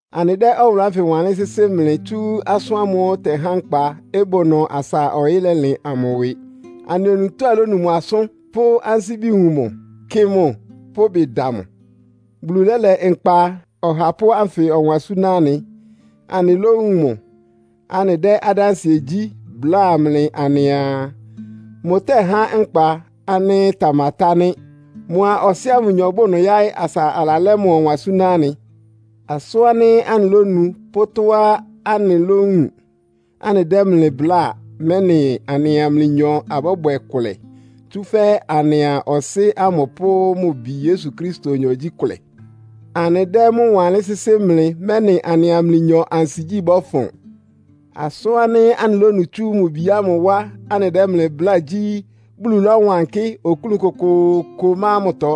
Anɩdɛ́ ɔwʋlʋ́ ánfɩ wanlɩ́n sɩ́sɩ́ mlɩ tsú Asʋ́n ámʋ́ʋ́ ɩtɛhá nkpa, ɩbʋ ɩnʋ asa ɔyɩ́ lɛlɩn amʋ ɩwɩ. Anɩ onutó anɩlónu mʋ asʋ́n, pʋ́ ansíbi wun mʋ, kɩ mʋ, pʋ́ ɩbɩ da mʋ. Bulu lɛ́lɛ Nkpa Ɔhapʋ́ ánfɩ ɔwan súná anɩ, anɩlówun mʋ. Anɩdɛ́ adánsɩɛ gyí, bláa mlɩ anɩaa, mʋtɛ́há nkpa ánɩ́ ɩtamatá nɩ́. Mʋa Ɔsɩ́ ámʋ nyɔ bʋ ɩnʋ yáɩ́, asa alalɛ́ mʋ ɔwan súná anɩ. Asʋ́n ánɩ́ anɩlónu pʋ́ tɔ́á anɩlówun anɩdɛ́ mlɩ bláa, mɛ́nɩ anɩa mlɩnyɔ abɔ́bwɛ kʋlɛ. Tsúfɛ́ anɩa Ɔsɩ́ ámʋ pʋ́ mʋ Bi Yesu Kristonyɔ gyí kʋlɛ. Anɩdɛ́ mʋ́ wanlɩ́n sɩ́sɩ́ mlɩ, mɛ́nɩ anɩa mlɩnyɔ ansigyí bɔ́fʋn. Asʋ́n ánɩ́ anɩlónu tsú mʋ Bi ámʋ wá, anɩdɛ́ mlɩ bláa gyí, Bulu lɔ́wankɩ́. Oklún kʋkʋʋkʋ má mʋtɔ.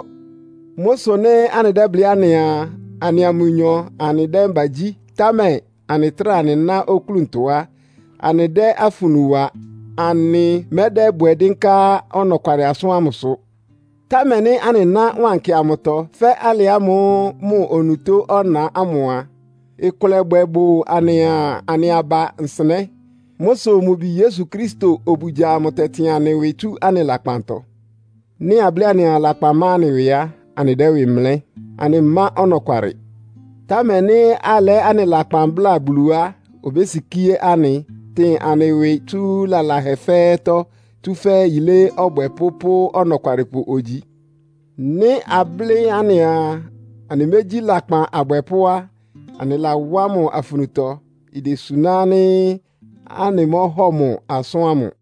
Mʋ́ sʋ nɩ́ anɩdɛ́blɩ́ anɩaa, anɩa mʋnyɔ anɩdɛ́ mbagyí, támɛ anɩtráa anɩná oklúntɔ á, anɩdɛ́ afunu wa. Anɩmɛ́dɛ́bwɛ dɩ́nká ɔnɔkwalɩ asʋ́n ámʋsʋ. Támɛ nɩ́ anɩná wankɩ amʋtɔ, fɛ́ alɩ ámʋ́ʋ́ mʋ onutó ɔna ámʋ a, ɩkʋlɛbwɛ bʋ anɩa anɩ aba nsɩnɛ́. Mʋ́ sʋ mʋ Bi Yesu Kristo obugya amʋ tɛtɩn anɩ ɩwɩ tsú anɩ lakpantɔ. Nɩ́ ablɩ́ anɩaa, lakpan ma anɩ ɩwɩ á, anɩdɛ́ ɩwɩ mlɛ́. Anɩmá ɔnɔkwalɩ. Támɛ nɩ́ alɛ́ anɩ lakpan bláa Bulu á, obésikíé anɩ, tɩn anɩ ɩwɩ tsú lalahɛ fɛ́ɛ́tɔ́, tsúfɛ́ yilé ɔbwɛpʋ́ pʋ́ ɔnɔkwalɩpʋ ogyi. Nɩ́ ablɩ́ anɩaa, anɩmégyí lakpan abwɛpʋ́ á, anɩlawá mʋ afunutɔ. Idesuná ánɩ́ anɩmɔ́hɔ mʋ asʋ́n ámʋ.